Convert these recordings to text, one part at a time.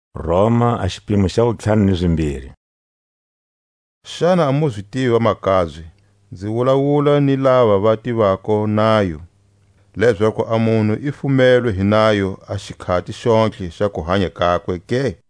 A ndlela wu tirako ha yona nayo. Xana a mu zi tivi vamakabye (nzi wulawula ni lava va tivako nayo), lezaku a munhu i fumelwe hi nayo a xikhati xontlhe xa kuhanya kakwe ke?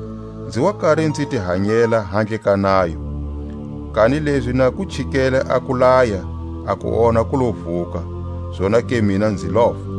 Nzi wa kari nzi ti hanyela handle ka nayo; kanilezi na ku chikele a kulaya a kuonha ku lo vuka, zonake mina nzi lofa;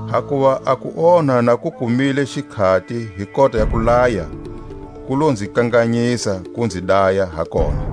Hakuva a kuonha na ku kumile xikhati hi kota ya kulaya, ku lo nzi kanganyisa ku nzi daya ha kona.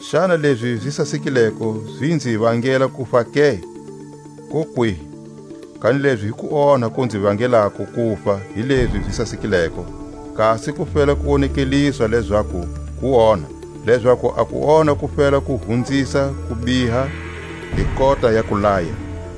Xana lezi zi sasekileko zi nzi vangele kufa ke? Kokwihi! Kanilezi hi kuonha ku nzi vangeleko kufa hi lezi zi sasekileko, kasi ku fela ku wonekeliswa lezaku kuonha; lezaku a kuonha ku fela ku hunzisa ku biha hi kota ya kulaya.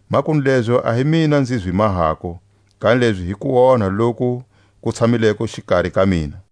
Makunu lezo a hi mina nzi zi mahako, kanilezi hi kuonha loku ku tshamileko xikari ka mina.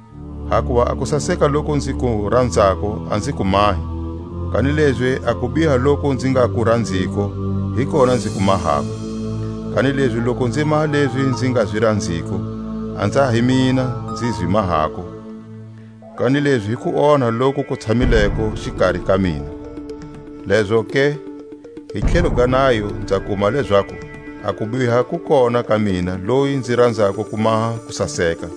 Hakuva a kusaseka loku nzi ku ranzako a nzi ku mahi; kanilezi a kubiha loku nzi nga ku ranziko, hi kona nzi ku mahako. Kanilezi loku nzi maha lezi nzi nga zi ranziko, a nza hi mina nzi zi mahako, kanilezi hi kuonha loku ku tshamileko xikari ka mina. Lezoke, hi tlhelo ga nayo nza kuma lezaku, a kubiha ku kona ka mina loyi nzi ranzako ku maha kusaseka.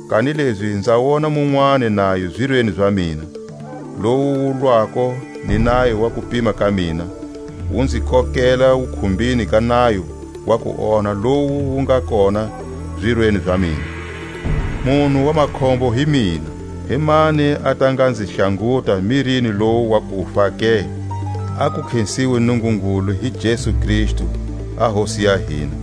Kanilezi nza wona munwani nayo zirweni za mina, lowu wu lwako ni nayo wa kupima ka mina, wu nzi kokela wukhumbini ga nayo wa kuonha lowu wu nga kona zirweni za mina. Munhu wa makhombo hi mina! Himani a ta nga nzi hlanguta mirini lowu wa kufa ke? A ku khesiwe Nungungulu hi Jesu Kristu a Hosi ya hina!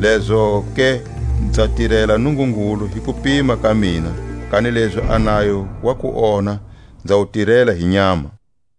Lezoke nza tirela Nungungulu hi kupima ka mina, kanilezi a nayo wa kuonha nza wu tirela hi nyama.